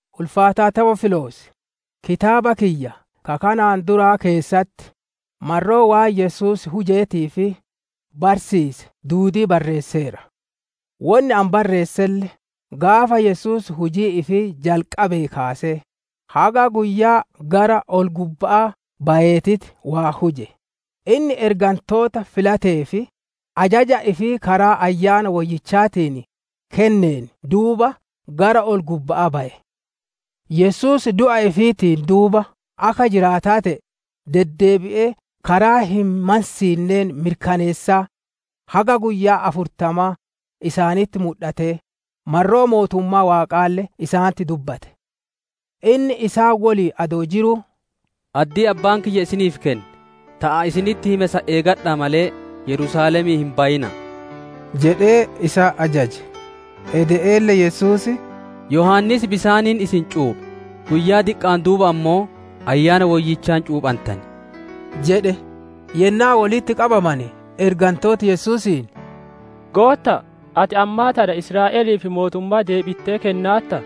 Ulfaataa Tewoofiloos! Kitaaba kiyya ka kanaan duraa keessatti marroo waan Yesuus hujeetii fi barsiise duudii barreesseera. Wonni ani barreesselle gaafa Yesuus hujii ifii jalqabeen kaasee, haga guyyaa gara ol gubba'aa bayeetitti waan huje; inni ergantoota filateef, ajaja ifii karaa Ayyaana Woyyichaatiin kenneen duuba gara ol gubba'aa baye. Yesuus du'a ifiitiin duuba akka jiraataa te'e, deddeebi'ee karaa hin mansiinneen mirkaneessaa haga guyyaa afurtamaa isaanitti mudhatee, marroo Mootummaa Waaqaalle isaanitti dubbate. Inni isaan woliin adoo jiruu, «Addii Abbaan kiyya isiniif kenne, ta ani isinitti hime san eegadha'a malee, Yerusaalemii hin bayina'a» jedhee isaan ajajaje. Ede'eelle Yesuus, «Yohaannis bisaaniin isin cuuphe; guyyaa diqqa'aan duuba ammoo Ayyaana Woyyichaan cuuphantan» jedhe. Yennaa wolitti qabamane ergantooti Yesuusiin, «Gootta'a, ati ammaa tana Israa'eliif Mootummaa deebittee kennaartaa?»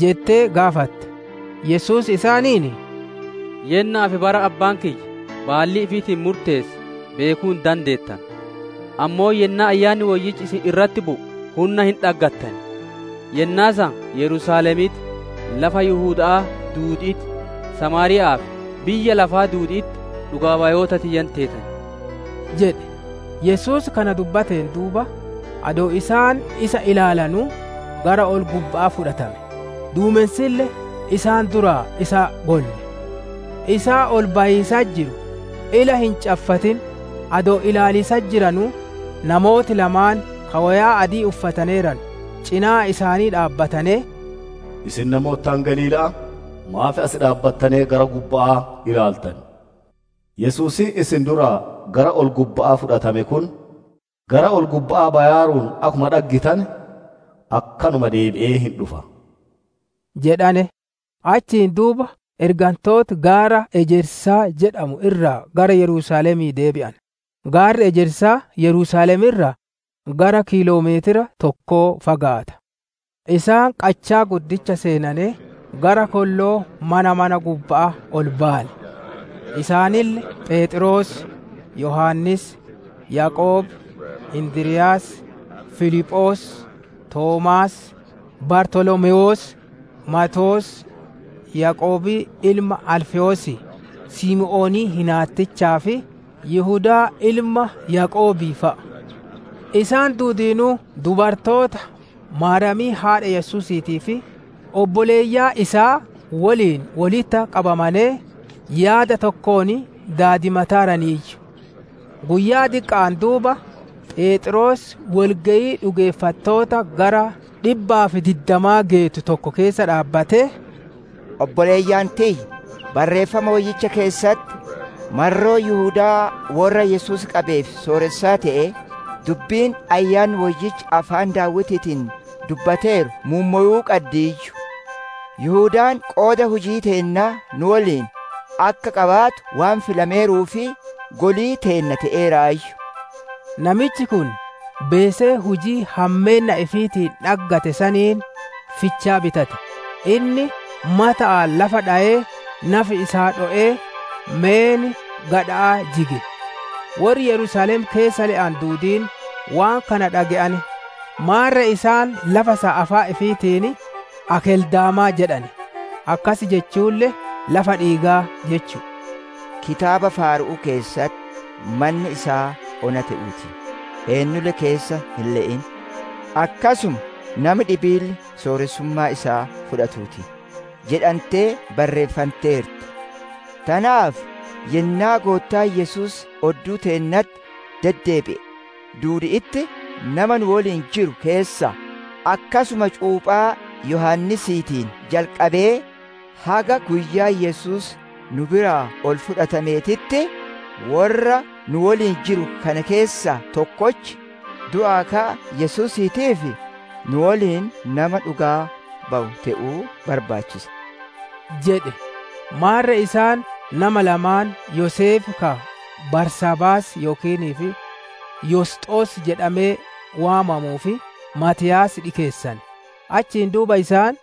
jettee gaafatte. Yesuus isaaniin, «Yenna'aa fi bara Abbaan kiyya baallii ifiitiin murteesse beekuu hin dandeettanu; ammoo yennaa Ayyaanni Woyyichi isin irratti bu'u, hunna hin dhaggattan; yennaa san Yerusaalemitti, lafa Yihuda'aa duudi'itti, Samaariya'aa fi biyya lafaa duudi'itti dhugaa bayoota tiyya hin teetan» jedhe. Yesuus kana jedheen duuba, adoo isaan isa ilaalanuu gara ol-gubba'aa fudhatame; duumensille isaan duraa isa golle. Isa ol bayiisatti jiru, ila hin caffatin adoo ilaaliisatti jiranuu, namooti lamaan ka woyaa adii uffataneeranu cinaa isaanii dhaabbatanee, «Isin namoota Galiila'aa, maaf asi dhaabbatanee gara gubba'aa ilaaltan? Yesuusiin isin duraa gara ol-gubba'aa fudhatame kun, gara ol-gubba'aa bayaaruun akkuma dhaggitane akkanuma deebi'ee hin dhufa» jedhane. Achiin duuba ergantooti gaara Ejersaa jedhamu irraa gara Yerusaalemii deebi'ane; gaarri Ejersaa Yerusaalem irraa gara kiiloo meetira tokko fagaata. Isaan qachaa guddicha seenanee, gara kolloo mana mana gubba'aa ol bayane. Isaanille Pheexroos, Yohaannis, Yaaqoob, Indiryaas, Filiphoos, Toomaas, Bartolomewoos, Maatewoos, Yaaqoobii ilma Alfewoosii, Simoonii hinaattichaa fi Yihudaa ilma Yaaqoobii fa'a. Isaan duudiinuu dubartoota, Maariyaamii haadha Yesuusiitii fi obboleeyyan isaa woliin wolitti qabamanee, yaada tokkoon daadimataaraniiyyu. Guyyaa diqqa'aan duuba, Pheexroos woli geyii dhugeeffattoota gara dhibbaa fi diddamaa geettu tokko keessa dhaabbatee, «Obboleeyyan tiyya, Barreeffama woyyicha keessatti, marroo Yihudaa worra Yesuus qabeef sooressaa te'ee, dubbiin Ayyaanni Woyyichi afaan Daawitiitiin dubbateeru muummowuu qaddiiyyu. Yihudaan qooda hujii teennaa nu woliin akka qabaatu waan filameeruuf, golii teenna te'eeraayyu. Namichi kun beesee hujii hammeenna ifiitiin dhaggate saniin, fichaa bitate; inni mata'aan lafa dhowee nafi isaa dho'ee, meen gadha'aa jige. Worri Yerusaalem keessa le'anu duudiin waan kana dhage'ane; maarre isaan lafa san afaan ifiitiin ‹Akeldaamaa› jedhane; akkas jechuulle ‹Lafa dhiigaa› jechu'u. «Kitaaba Faaru'uu keessatti, « ‹Manni isaa ona te'uu ti; eennulle keessa hin le'in›, akkasuma, ‹Nami dhibiille sooressummaa isaa fudhatuu ti› jedhantee barreeffanteerti. Tanaaf yennaa Goottaan Yesuus odduu teennatti deddeebi'e duudi'itti nama nu woliin jiru keessaa, akkasuma cuuphaa Yohaannisiitiin jalqabee, haga guyyaa Yesuus nu biraa ol fudhatameetitti, worra nu woliin jiru kana keessaa tokkochi, du'aa ka'a Yesuusiitiif, nu woliin nama dhugaa bawu te'uu barbaachisa» jedhe. Maarre isaan nama lamaan Yoseef ka barsaabaas yookiin Yosxos jedhamee waamamuu fi Maatiyaas dhikeessane. Achiin duuba isaan,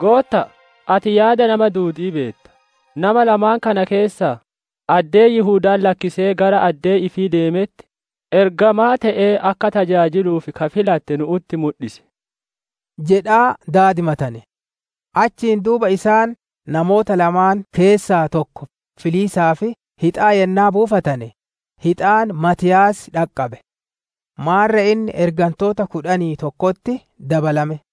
«Gootta'a, ati yaada nama duudi'ii beetta; nama lamaan kana keessaa, addee Yihudaan lakkisee gara addee ifii deemetti, ergamaa te'ee akka tajaajiluuf ka filatte nu'utti mudhisi» jedhaa daadimatane. Achiin duuba isaan namoota lamaan keessaa tokko filiisaaf hixaa yennaa buusane, hixaan Maatiyaas dhaqqabe. Maarre inni ergantoota kudhanii tokkotti dabalame.